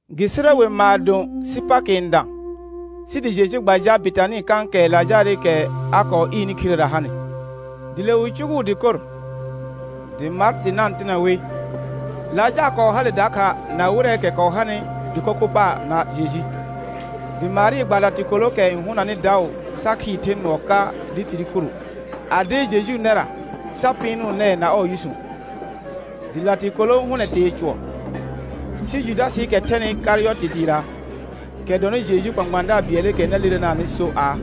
Gɩ sɩrɛ we maadõ sɩ Pakɩ n dã, sɩ dɩ Jeju gba jal Betanɩ kãkɛ Lajaarɩkɛ a kɔɔ ɩɩrnɩ khirera hanɩ. Dɩ le wɩ cʋgʋʋ dɩkor, dɩ Martɩ na-n tɩnɛ wɩ. Lajaar kɔɔ hale dakha na wɩrɛɛkɛ kɔɔ hanɩ dɩko kho paar na Jeju. Dɩ Marɩ gba latɩkolookɛ n hʋnanɩ daʋ sa khɩɩr the nʋɔ ka litiri kuru, a deer Jejuu nɛra sa pɩɩnʋʋ nɛɛ na ɔɔ yʋsũ, dɩ latɩkolo hʋnɛ tee cʋɔr. Sɩ Judasɩɩkɛ thɛnɩ Karɩyɔtɩ dɩɩra, kɛ dɔnɩ Jejuu kpãkpãadaar bɩɛlɩkɛ na lirenaanɩ so aa: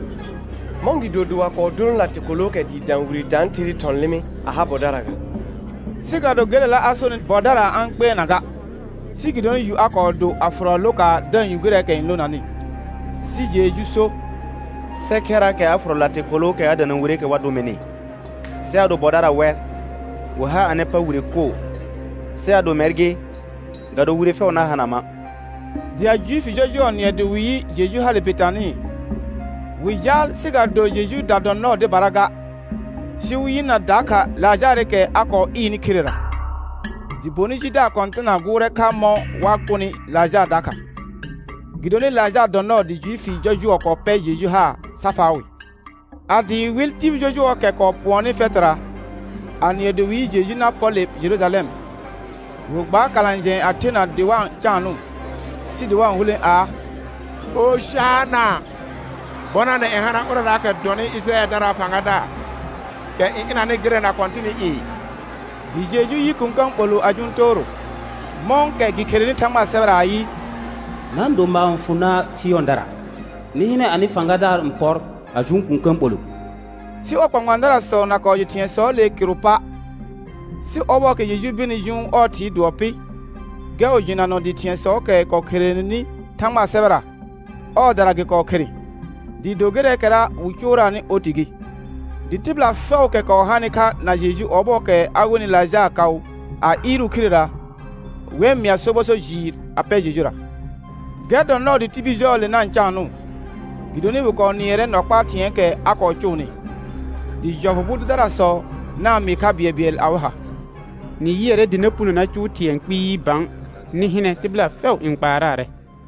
Mɔ̃gɩdo dɩ wa kɔɔ dolõ latɩkolookɛ dɩɩ dã wire tãatherɩɩ thɔ̃ lɩmɩ a ha bɔdara ga? Sɩ ga do gelela a sonɩ bɔdara a-n kpɩɛrna ga, sɩ gɩdonɩ yu a kɔɔ do a fʋrɔ lokaar da-n yu gɩrɛɛkɛ n lonanɩ. Sɩ Jeju so: Sɛ khɛrraakɛ a fʋrɔ latɩkolookɛ a dana wireekɛ wa dʋ mɩnɩ. Sɩ ado bɔdara wɛ, wɩ har anɩ pa wire koo, sɩ ado mɛr gɩ ga do wire fɛʋ na hana ma'. Dɩ a Juifi jɔjʋɔ nɩɛ dɩ wɩ yɩ Jeju hale Betanɩ, wɩ jaal sɩ ga do Jejuuda dɔ nɔɔ dɩbara ga, sɩ wɩ yɩna dakha Lajaarɩkɛ a kɔɔ ɩɩrnɩ khirera. Dɩ bonɩ jidaar kɔ̃tɩna gʋʋrɛ kha mɔ̃ wa kʋnɩ Lajaar dakha, gɩdonɩ Lajaar dɔ nɔɔ dɩ Juifi jɔjʋɔ kɔɔ pɛr Jeju haar sa faa wɩ. A dɩɩ wɩl tibil jɔjʋɔɔkɛ kɔɔ pʋɔnnɩ fɛtɩra, a nɩɛ dɩ wɩ yɩ Jeju na pɔr le Jerujalɛm, wɩ gbaar kalã jɛ̃ɛ a thena dɩ wa-n caanʋʋ, sɩ dɩ wa-n hulẽ aa: «Ojana, bɔnanɛ n hana ʋrɛraakɛ dɔnɩ Ɩjɩrayɛldaraa fãgadaar, kɛ n ɩnanɩ gɩrɛ na Kɔ̃tɩnɩ i.» Dɩ Jeju yɩ kũkə̃ ɓolʋ a jʋʋn tooro, mɔ̃kɛ gɩ kherenɩ Thãgbaa sɛbɛra ayɩ: «Na-n do maar n fʋ na' Sɩyɔ̃dara Nɩ hɩnɛ anɩ fãgadaar n pɔr, a jʋʋn kũkə̃ ɓolʋ.» Sɩ ɔɔ kpãkpãadarasɔ na kɔɔ jɩ thɩ̃ɛsɔɔle kɩrʋ pa', sɩ ɔbɔɔkɛ Jeju kɔɔ birni jʋʋn ɔɔ Thɩɩ dʋɔ pɩ, gɛr wɩ jɩnanɔ dɩ thɩ̃ɛsɔɔkɛ kɔɔ kherenenɩ Thãgbaa sɛbɛra, ɔɔdara gɩ kɔɔ khere, dɩɩ do gɩrɛɛkɛra wɩ cʋʋraanɩ oti gɩ. Dɩ tɩbɩla fɛʋʋkɛ kɔɔ hanɩ kha na Jeju ɔbɔɔkɛ a wenɩ Lajaar kaʋ a ɩɩrʋʋ khirera, wɛr mɩa sobɔ so jɩɩr a pɛ Jejura. Gɛr dɔ nɔɔ dɩ tibil jɔɔle na-n caanʋʋ, gɩdonɩ wɩ kɔɔ nɩɛrɛ nɔ kpaa thɩ̃ɛɛkɛ a kɔɔ cʋʋnɩ. Dɩ jɔfʋ bʋ dʋdarasɔ na-n mɩɩ kha bɩɛlbɩɛl awɩ ha: Nɩ yɩɛrɛ dɩ na puno na cʋʋ thɩ̃ɛ kpɩɩ bã. Nɩ hɩnɛ, tɩbɩla fɛʋ n kpaaraarɛ.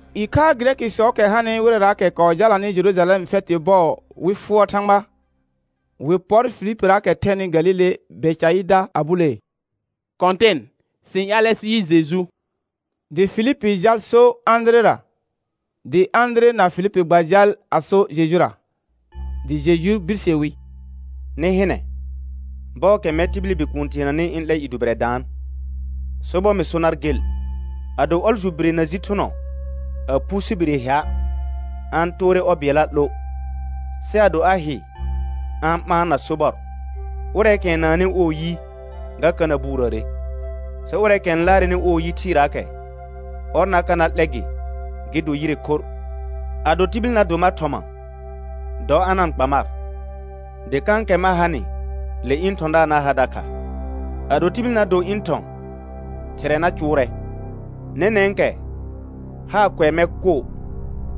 Ɩkhaa Gɩrɛkɩsɔɔkɛ hanɩ wɩrɛraakɛ kɔɔ jalanɩ Jerujalɛm fɛtɩ bɔɔ wɩ fʋɔr Thãgba, wɩ pɔr Filipiraakɛ thɛnɩ Galile Bɛcaɩda a bulee: Kɔ̃tɩn, sɩ-n ƴaalɛ sɩ yɩ Jeju. Dɩ Filipi jal so Ãdirera, dɩ Ãdire na Filipi gba jal a so Jejura. Dɩ Jeju birse wi: Nɩ hɩnɛ, bɔɔkɛ mɛr tibili Bikuun teenanɩ ɩ̃ 'lɛ i dʋbɩrɛ daan. Sobɔr mɩ so nar gel, ado ɔljʋ bire na ji thʋnɔ a phu sɩ bire hɩa', a-n toore ɔ bɩɛlla 'lo. Sɩ ado a hɩ a-n ɓaan na sobɔr. Ʋrɛɛkɛ n naannɩ ɔɔ yi, ga ka na buurəəre, sɩ ʋrɛɛkɛ n laarɛnɩ ɔɔ yi thɩɩraakɛ, ɔr na ka na 'lɛ gɩ gɩ do yire khorr. Ado tibil na do mar thɔma, dɔ a na-n kpa mar, dɩ kãkɛ ma hanɩ le ɩ̃ thɔ̃daar na ha dakha. Ado tibil na do ɩ̃ thɔ̃ Thɩrɛ na cʋʋrɛ. Nɛnɛ̃kɛ haar kʋɛ mɛr koo,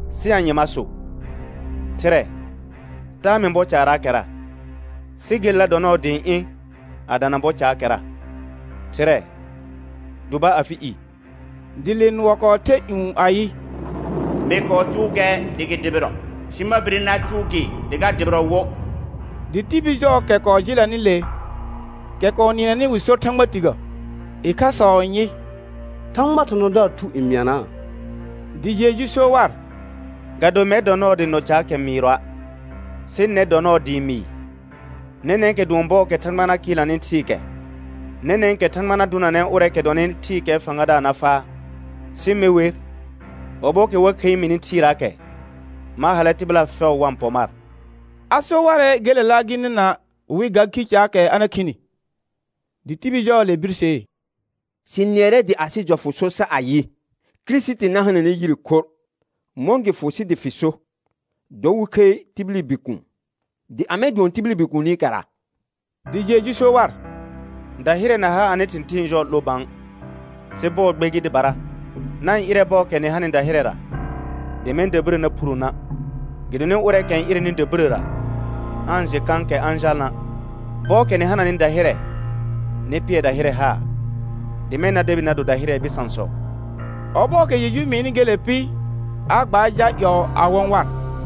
sɩ anye ma so? Thɩrɛ, taa mɩ bɔ caaraakɛra. Sɩ gelela dɔ nɔɔ dɩ ɩ̃ ɩ̃ a dana bɔ caakɛra. Thɩrɛ, dʋba afɩ i. Dɩ le nʋɔ kɔɔ the ƴũ ayɩ: Mɩ kɔɔ cʋʋ gɛr dɩ gɩ dʋbɩrɔ, sɩ ma bire na cʋʋ gɩ dɩ ga dʋbɩrɔ wo. Dɩ tibil jɔɔkɛ kɔɔ jɩlɛnɩ le, kɛ kɔɔ nɩɛnɛnɩ wɩ sor thãgba tigə. Ɩkhasɔ n yɩ: Thãgbaa thɔ̃thɔ̃daar thu n mɩanaa. Dɩ Jeju so war: Ga do mɛr dɔ nɔɔ dɩ nɔ caakɛ mɩɩrɔa', sɩ nɛr dɔ nɔɔ dɩɩ mɩɩ. Nɛnɛ̃kɛ dʋɔn bɔɔkɛ Thãgba na kɩɩlnanɩ thɩɩkɛ. Nɛnɛ̃kɛ Thãgba na dʋnanɛ ʋrɛɛkɛ dɔnɩ thɩɩkɛɛ fãgadaar na faa. Sɩ me wer, ɔbɔɔkɛ wa khəi mini thɩɩraakɛ, ma hallɛ tɩbɩla fɛʋ wa-n pɔ mar. A so warɛ gelela gɩ nɩna wɩ ga khi caakɛ a na khini. Dɩ tibil jɔɔle birsee: Sɩ nɩɛrɛ dɩ asɩ jɔfʋ so sar ayɩ: Kirisiti na hananɛ yire khorr. Mɔ̃ gɩ fʋ sɩ dɩ fɩ so: Dɔ wɩ khəi tibili Bikuun? Dɩ amɛ dʋɔn tibili Bikuunikɛra? Dɩ Jeju so war: Dahɩrɛ na ha anɩ thɩ̃thɩɩn jɔɔ 'lo bã, sɩ bɔɔ gbe gɩ dɩbara. Na-n ɩrɛ bɔɔkɛ nɩ hananɩ dahɩrɛ dɩ mɛ̃ dabirə na phuro na', gɩdonɩ ʋrɛɛkɛ n ɩrɛnɩ dabirəra, aa-n jɩ kãkɛ a-n jalna'. Bɔɔkɛ nɩ hananɩ dahɩrɛ nɩ pɩɛr dahɩrɛ haar, dɩ mɛ̃ na debi na do dahɩrɛɛ bɩsãsɔ. Ɔbɔɔkɛ Jeju mɩɩnɩ gele pɩ, a gbaar jal ƴɔɔ a wɔ̃ war.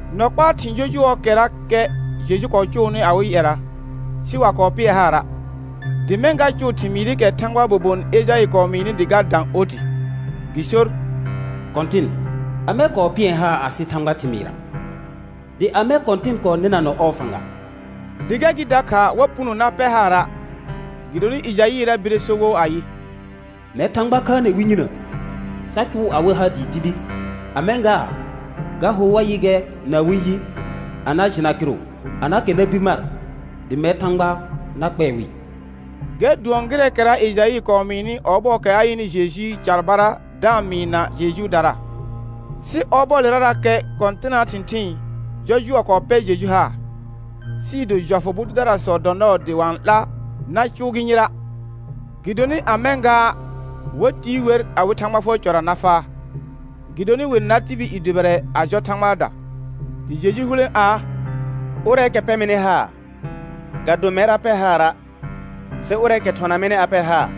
Nɔ kpaa thɩ̃ jɔjʋɔɔkɛrakɛ Jeju kɔɔ cʋʋnɩ awɩ ƴɛra, sɩ wa kɔɔ pɩɛ haara', dɩ mɛ̃ ga cʋʋ thɩmɩɩrɩkɛ Thãgbaa bobon Ejaɩ kɔɔ mɩɩnɩ dɩ ga dã oti. Gɩ sor: «Kɔ̃tɩn, amɛ kɔɔ pɩɛr haar asɩ Thãgbaa thɩmɩɩra? Dɩ amɛ Kɔ̃tɩn kɔɔ nɩnanɔ ɔɔ fãga?» Dɩ gɛr gɩ dakha wa puno na pɛr haara', gɩdonɩ Ejaɩra bire so wo ayɩ: «Mɛr Thãgba khaanɛ wɩ yinə, sa cʋʋ awɩ ha dɩɩ dibi. A mɛ̃ gaa, ga hor wa yɩ gɛr na awɩ yi a na jɩna kɩrʋ, a na kɛr na bir mar, dɩ mɛr Thãgba na kpɛɛ wɩ.» Gɛr dʋɔn gɩrɛɛkɛra Ejaɩ kɔɔ mɩɩnɩ ɔbɔɔkɛ a yɩnɩ Jejuu carbara da-n mɩɩna Jejuudara. Sɩ ɔbɔɔlerarakɛ kɔ̃tɩnaa thɩ̃thɩɩn jɔjʋɔ kɔɔ pɛr Jeju haar, sɩɩ do jɔfʋ bʋ dʋdarasɔ dɔ nɔɔ dɩ wa-n 'la na cʋʋ gɩ yɩra', gɩdonɩ a mɛ̃ gaa, wa tiir wer awɩ Thãgba fʋɔr cɔra na faa. Gɩdonɩ wɩ nar tibil i dʋbɩrɛ a jɔ Thãgbaada. Dɩ Jeju hulẽ aa: Ʋrɛɛkɛ pɛ mɩnɩ haar ga do mɛr a pɛ haara', sɩ ʋrɛɛkɛ thɔna mɩnɩ a pɛr haar.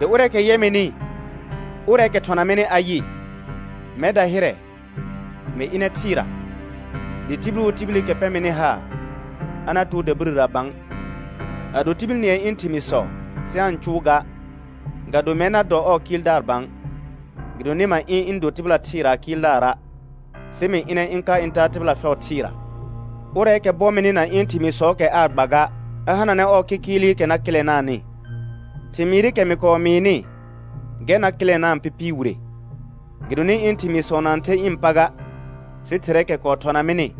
Dɩ ʋrɛɛkɛ yɛ mɩnɩ, ʋrɛɛkɛ thɔna mɩnɩ a yɩ. Mɛr dahɩrɛ, mɩ ɩnɛ thɩɩra, dɩ tibil wo tibilikɛ pɛ mɩnɩ haar, a na too dabirəra bã. Ado tibil nɩɛ ɩ̃ thɩmɩɩsɔ sɩ aa-n cʋʋ ga, ga do mɛr na dɔ ɔɔ Kɩɩldaar bã, gɩdonɩ ma ɩ̃ ɩ̃ do tɩbɩla thɩɩraa Kɩɩldaara', sɩ mɩ ɩnɛ ɩ̃ ka ɩ̃ taa tɩbɩla fɛʋ thɩɩra. Ʋrɛɛkɛ bɔ mɩnɩ na ɩ̃ thɩmɩɩsɔɔkɛ aa gba ga, a hananɛ ɔɔ kɩkɩɩlɩkɛ na kɩlɛnaanɩ: Thɩmɩɩrɩkɛ mɩ kɔɔ mɩɩnɩ, gɛr na kɩlɛnaa pɩpɩɩ wire. Gɩdonɩ ɩ̃ thɩmɩɩsɔ na-n the ɩ̃ pa ga, sɩ Thɩrɛɛkɛ kɔɔ thɔna mɩnɩ,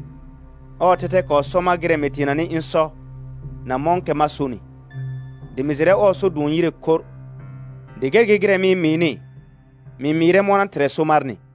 ɔɔ thɛthɛ kɔɔ sɔ mar gɩrɛ mɩ teenanɩ ɩ̃ sɔ na mɔ̃kɛ ma sonɩ. Dɩ mɩ jɩrɛ ɔɔ so dʋɔn yire khorr. Dɩ gɛr gɩ gɩrɛ mɩ-n mɩɩnɩ, mɩ-n mɩɩrɛ mɔna Thɩrɛ so marnɩ.